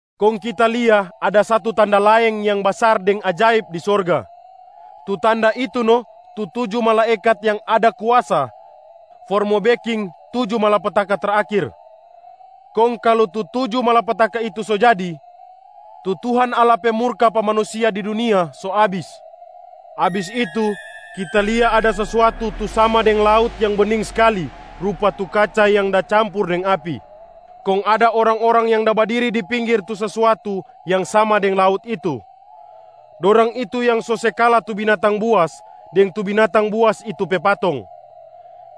Kong kita lia ada satu tanda laeng yang basar deng ajaib di sorga. Tu tanda itu no tu tuju malaekat yang ada kuasa for mo beking tuju malapetaka terakhir. Kong kalu tu tuju malapetaka itu so jadi, tu Tuhan Allah pe murka pa manusia di dunia so abis. Abis itu, kita lia ada sesuatu tu sama deng laut yang bening skali rupa tu kaca yang da campur deng api, kong ada orang-orang yang da badiri di pinggir tu sesuatu yang sama deng laut itu. Dorang itu yang so se kala tu binatang buas deng tu binatang buas itu pe patong,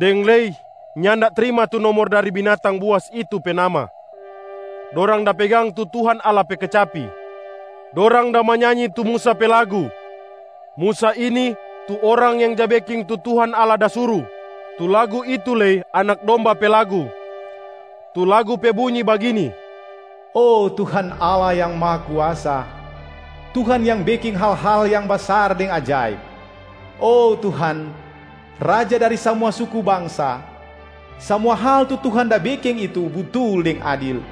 deng lei nyanda trima tu nomor dari binatang buas itu pe nama. Dorang da pegang tu Tuhan Allah pe kecapi. Dorang da manyanyi tu Musa pe lagu, Musa ini tu orang yang ja beking tu Tuhan Allah da suru. Tu lagu itu lei Anak Domba pe lagu. Tu lagu pe bunyi bagini, “Oh Tuhan Allah Yang Mahakuasa, Tuhan yang beking hal-hal yang basar deng ajaib. Oh Tuhan, Raja dari samua suku bangsa, samua hal tu Tuhan da beking itu butul deng adil.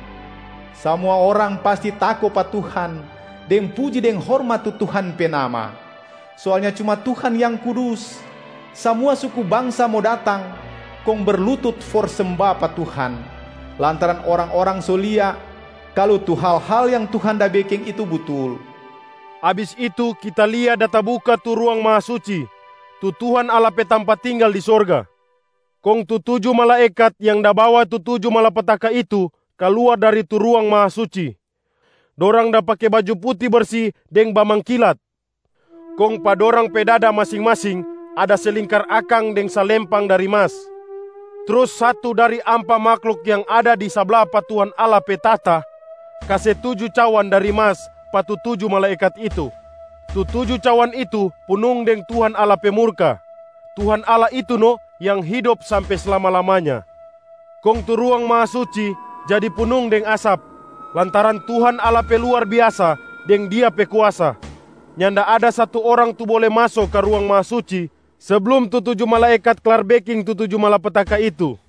Samua orang pasti tako pa Tuhan, deng puji deng hormat tu Tuhan pe Nama. Soalnya cuma Tuhan yang kudus. Samua suku bangsa mo datang kong berlutut for semba pa Tuhan, lantaran orang-orang so lia kalu tu hal-hal yang Tuhan da beking itu butul.” Abis itu kita lia da tabuka tu Ruang Mahasuci, tu Tuhan Allah pe tampa tinggala di sorga. Kong tu tuju malaekat yang da bawa tu tuju malapetaka itu kaluar dari tu Ruang Mahasuci. Dorang da pake baju puti bersi deng bamangkilat, kong pa dorang pe dada masing-masing ada se lingkar akang deng salempang dari mas. Trus satu dari ampa mahluk yang ada di sabla pa Tuhan Allah pe tahta kase tuju cawan dari mas pa tu tuju malaekat itu. Tu tuju cawan itu punung deng Tuhan Allah pe murka. Tuhan Allah itu no yang hidop sampe slama-lamanya. Kong tu Ruang Mahasuci jadi punung deng asap lantaran Tuhan Allah pe luar biasa deng Dia pe kuasa. Nyanda ada satu orang tu bole maso ka Ruang Mahasuci seblum tu tuju malaekat klar beking tu tuju malapetaka itu.